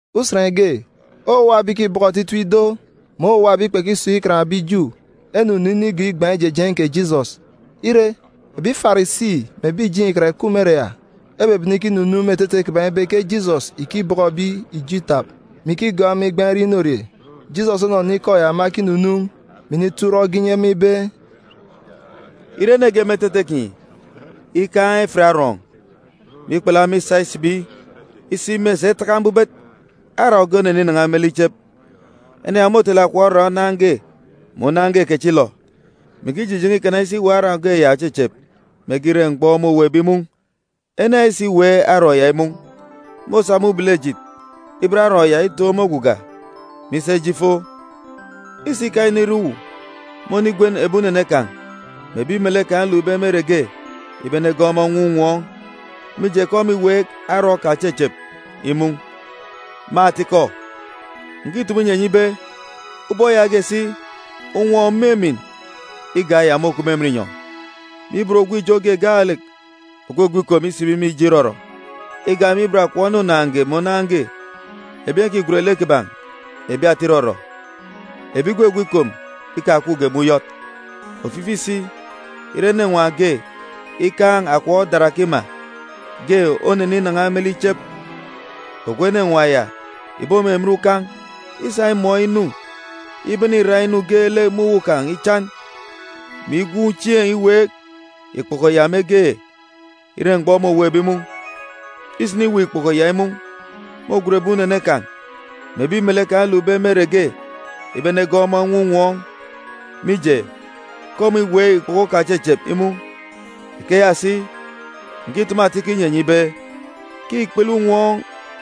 Usen ge, owuwa ebi ìkibọkọ otitip ido mè owuwa ebi kpekisun̄ Ikan ebi Ju enunu inigọọk igban̄ ijejeen̄ kè Jisọs. Ire, ebi Farisi mè ebi ìjeen̄ Ikan ìkup me ere ya ebebene ikinunuun̄ me etete kiban̄ ibe ke Jisọs ìkibọkọ ebi ijo itap, mè ikigọọk ema igbaan̄ irie inorie. Jisọs onọnọ ikọ ya ema ekinunuun̄, mè inito urọk ge inyi ema ibe, “Ire ene ge me etete kinyi ikaan̄ efit arọọn̄, mè ikpulu ema isa isibi isi mè esi etaka mbubet, arọọn̄ ge oneninan̄a me lek ichep, ene ya môtele akọp arọọn̄ onaan̄ge mè onaan̄ge kechilọ, mè ikijijen̄e ikana isi iweek arọọn̄ ge ya òchechep mege ire mgbọ môweekbe imun̄. Ene ya isiweek arọọn̄ ya imun̄, môsa me ubelejit iben arọọn̄ ya itoon̄ me oguga, mè isa ije ifo. Isika inire uwu, mônigwen ebi unene kan̄, mè ebi melek kan̄ elukbe me ere ge ibe enegọọk ọmọ enwọọn̄ unwọọn̄, mije ke ọmọ îweek arọọn̄ kan̄ òchechep imun̄. Me atikọ, ǹkitumu inyi enyi ibe, ubọk yaage si, unwọọn̄ òmimin igak eya môkup me emen inyọn̄ me ibot ogwu ijo ge gaalek ògwugwu ikom isibi me ijo irọrọ, igak me ibot akọp ene onaan̄ge mè onaan̄ge ebi ìkigwen lek kiban̄ ebi ata irọrọ, ebi igwugwu ikom ikakupge me uyọt. “Ofifi si, ire enenwaan̄ ge ikaan̄ akọp darakima, ge oneninan̄a me lek ichep, ogwu enenwaan̄ ya ìbomimin ukan̄ isa imọọn̄ inu ibene irak inu geelek me uwu kan̄ ichan, mè igwuun̄ chieen̄ iweek ikpoko ya mege ire mgbọ môweekbe imun̄. Isiniweek ikpoko ya imun̄, môgwen ebi unene kan̄ mè ebi melek kan̄ elukbe me ere ge ibe enegọọk ọmọ enwọọn̄ unwọọn̄, mije, ke ọmọ îweek ikpoko kan̄ òchechep imun̄. Ikeya si, ǹkitumu atikọ inyi enyi ibe ke ikpele unwọọn̄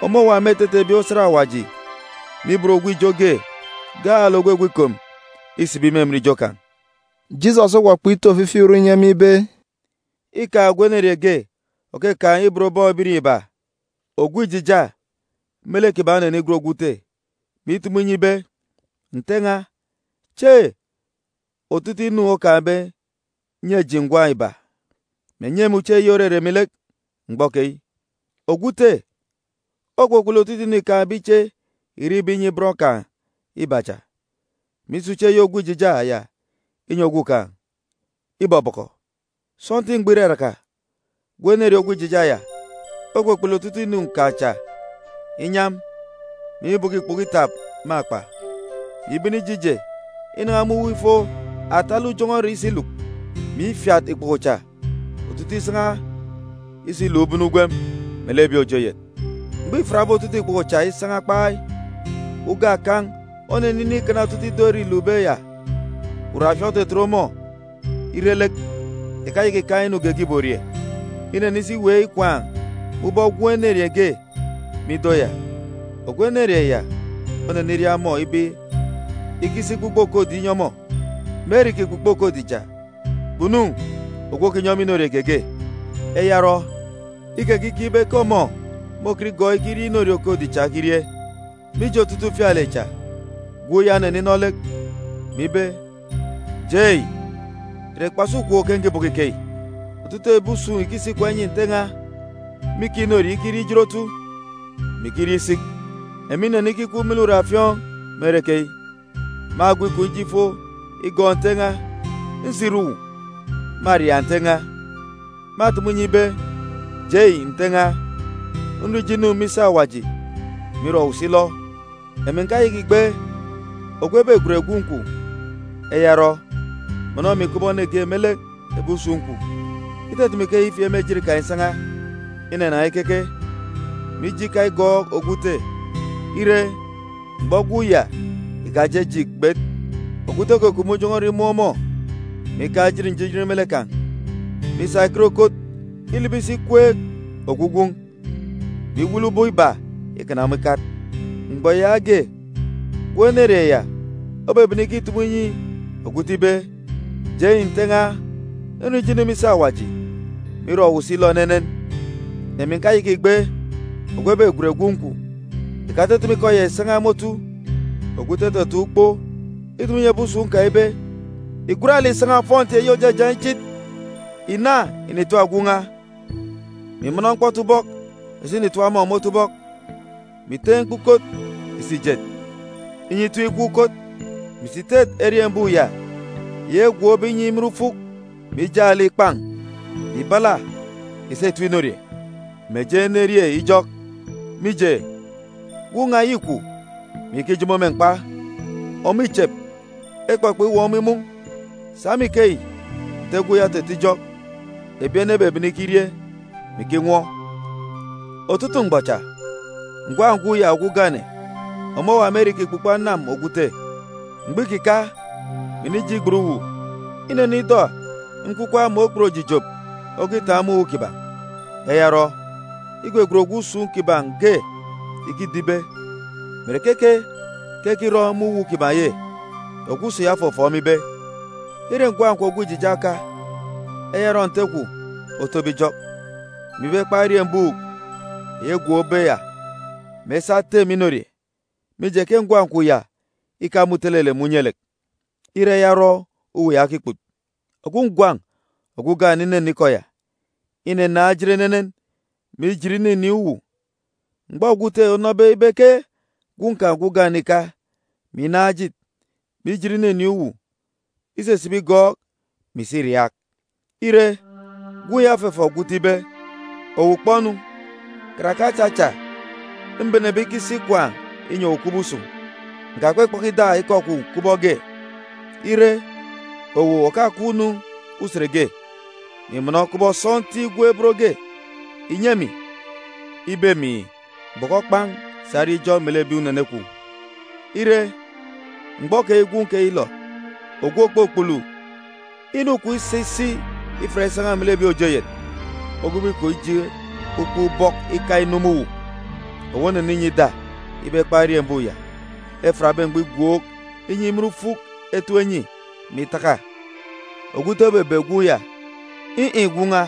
ọmọ òwa me etete ebi osat Awaji me ibot ogwu ijo ge gaalek ògwugwu ikom isibi me emen ijo kan̄.” Jisọs okpọkpọk ito ofifi urọk inyi ema ibe, “Îkaan̄ ogwu enerieen̄ ge òkakaan̄ ibot bọn ebirieen̄ iba. Ogwu ijija me lek kiban̄ onenigwen ogwu ute, mè itumu inyi ibe, ‘Nte n̄a, che otutuuk inu okaan̄be nyi eji ngwan̄ iba, mè nyi emi uche eyi òrere emi lek mgbọ keyi.’ Ogwu ute okpukpulu otutuuk inu îkaan̄be iche irek iba inyi bọn kan̄ iba cha, mè isa uche eyi ogwu ijija ya inyi ogwukaan̄. Ibọbọkọ. “Sọntiik mgbọ iraraka, gwun̄ enerieen̄ ogwu ijija ya okpukpulu otutuuk inu kan̄ cha inyam, mè ibọkọ ikpoko itap me akpa, mè ibene ije ije inan̄a me uwu ifo atalek ujọn̄ọ ere isi iluk, mè ifiat ikpoko cha otutuuk isan̄a isa iluk ubene ugwem melek ebi òje oyet. Mgbọ îfiatbe otutuuk ikpoko cha isan̄a kpai, uga akan̄ oneninin̄ ikana otutuuk ido ere îlukbe ya. Uraafiọọn̄ otetet ọmọ ire lek, ìkayaka ìkaan̄ inu geege ìborie. Inenisi iweek ikwaan̄ me ubọk gwun̄ enerieen̄ ge me ido ya. Ogwu enerieen̄ ya oneniria ọmọ ibe ikisi ikpukpo okodi inyi ọmọ. Me ere ìkikpukpo okodi cha, kpunu ogwu òkinyi ọmọ inorie geege. Eya orọ, ikekikeek ibe ke ọmọ môkọt igọọk ikirie inorie okodi cha okirie. “Mije otutuuk ufialek cha, gwun̄ ya oneninọ lek, mè ibe, ‘Jei! Ìre kpasi ukwook ke nkibọkọ ikeyi? Otutuuk ebi usun̄ ìkisi ikwaan̄ inyi nte n̄a mîkaan̄ inorie ikirie ijot otu, mè ikirie isik. Emi nnenikikwu me lek uraafiọọn̄ me ere keyi! Mâgwu ikom ije ifo igọọk nte n̄a. Nsire uwu, mâriaak nte n̄a, mè itumu inyi ibe: Jei, nte n̄a, nrọ ijo inu me isi Awaji, mè irọ owu si ilọ. Emi ǹkayaka ìgbe ogwu ebegwen gwun̄ kwun̄. Eya orọ, mọnọ emi kubọk ene ge me lek ebi usun̄ kwun̄.’ Itutumu ikeya ifieek me ejit kan̄ isan̄a, inanan̄a ikeke, mè ije ika igọọk ogwu ute. Ire, mgbọ gwun̄ ya ìkajeje ìgbet, ogwu ute okukup me ujọn̄ọ ere ibene chieen̄ imun̄ ọmọ, mè ikaan̄ njijin me lek kan̄, mè isa ekot ekot ilibi isi ikweek ogwu gwun̄, mè iwele ubọk iba ikana ọmọ ikat. “Mgbọ yaage, gwun̄ enerieen̄ ya obebene ikitumu inyi ogwu ute ibe, ‘Jei Nte n̄a, nrọ ijo inu me isi Awaji, mè irọ owu si ilọ enenen. Emi ǹkayaka ìgbe ogwu ebegwen gwun̄ kwun̄.’ “Ìkatutumu ikọ ya ìsan̄a me otu, ogwu ute otataan̄ ukpo itumu inyi ebi usun̄ kan̄ ibe, ‘Ìgwat lek ìsa ofọnti eyi òjajaan̄ ichit ìna ìnitap gwun̄ n̄a, mè ìmọnọ mkpọtubọk ìsa ìnitap ọmọ me otubọk, mè ìteen̄ ikpukot ìsa ìjet, inyi itap ikwek ukot, mè ìsi ìtet eriembuuk ya eyi egwookbe inyi imin ufuk mè ijaan̄ lek ìkpan̄, mè ìbala ìsa ìtem inorie, mè eji enerie ijọk. Mije, gwun̄ n̄a yi îkwu, mè iyaka ijomo me mkpa. Ọmọ îchep, ekpọkpọk iweek ọmọ imun̄.’ Sa me ikeyi, nte gwun̄ ya ototo ijọk, ebi ene ebebene ikirie, mè ikinwọ. “Otutuuk mgbọ cha, ngwan̄ gwun̄ ya ogwu ugane ọmọ òwa me ere îkikpukpo anam ogwu ute. Mgbọ îkika, mè inije igbet uwu, inọnọ ida nkwukwak mè okput òjijop okitaan̄ me uwu kiban̄. Eya orọ, igwegwen ogwu usun̄ kiban̄ ge ikido ibe mè ìre keke ke ekirọ me uwu kiban̄ ye? Ogwu usun̄ ya ofọfọọk ọmọ ibe, ‘Îre ngwan̄ kwun̄ ogwu ijija oka. Eya orọ nte kwun̄ otobe ijọk, mè ibe ekpan̄ eriembuuk eyi egwookbe ya, mè esa etem inorie, mije ke ngwan̄ kwun̄ ya îka me utelelek mè unye-lek. Îre eya orọ uwu okikput.’ “Ogwu ngwan̄ ogwu ugane inọnọ ikọ ya, inanaan̄ ejit enenen, mè ijit ininin̄ uwu. Mgbọ ogwu ute onọbe ibe ke gwun̄ kan̄ ogwu ugane îka, mè inaan̄ ejit, mè ijit ininin̄ uwu, isisibi igọọk, mè isi iriaak. Ire, gwun̄ ya ofọfọọk ogwu ute ibe, ‘Owu kpọ-nu, karake acha acha mbenebe ikisi ikwaan̄ inyi owu kubọk usun̄, ǹkakpaka ida ikọ kwun̄ kubọk ge. Ire, owu òkakup-nu usen ge, mè ìmọnọ kubọk sọntiik gwun̄ ebot ge ìnyi emi ibe emi, “Bọkọ kpan̄ sa rie ijọk melek ebi unene kwun̄.” Ire, mgbọ keyi gwun̄ kwun̄ yilọ, ogwu òkpukpulu inu kwun̄ isa isi ifiat isan̄a melek ebi òje oyet, ogwube ikom ije ukpọk ubọk ika inu me uwu, owu oneninyi ida ibe ekpan̄ eriembuuk ya efiatbe mgbọ igwook inyi imin ufuk etem enyi, mè itaka.’ “Ogwu ute obebe gwun̄ ya, ‘In̄-in̄ gwun̄ n̄a!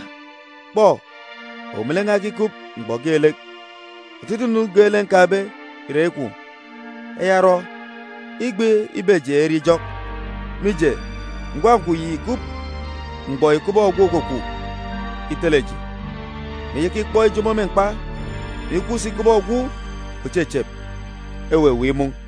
Kpọ, owu melek n̄a ekikup mgbọ geelek. Otutuuk inu geelek nkaan̄be ìre eyi kwun̄. Eya orọ, îgbe ibe eji erie ijọk, mije, ngwan̄ kwun̄ yi ìkup mgbọ yi kubọk ogwu òkwukwu itele eji, mè iyaka ikpọk ijomo me mkpa, mè ikup si kubọk ogwu òchechep, eweweek imun̄.’”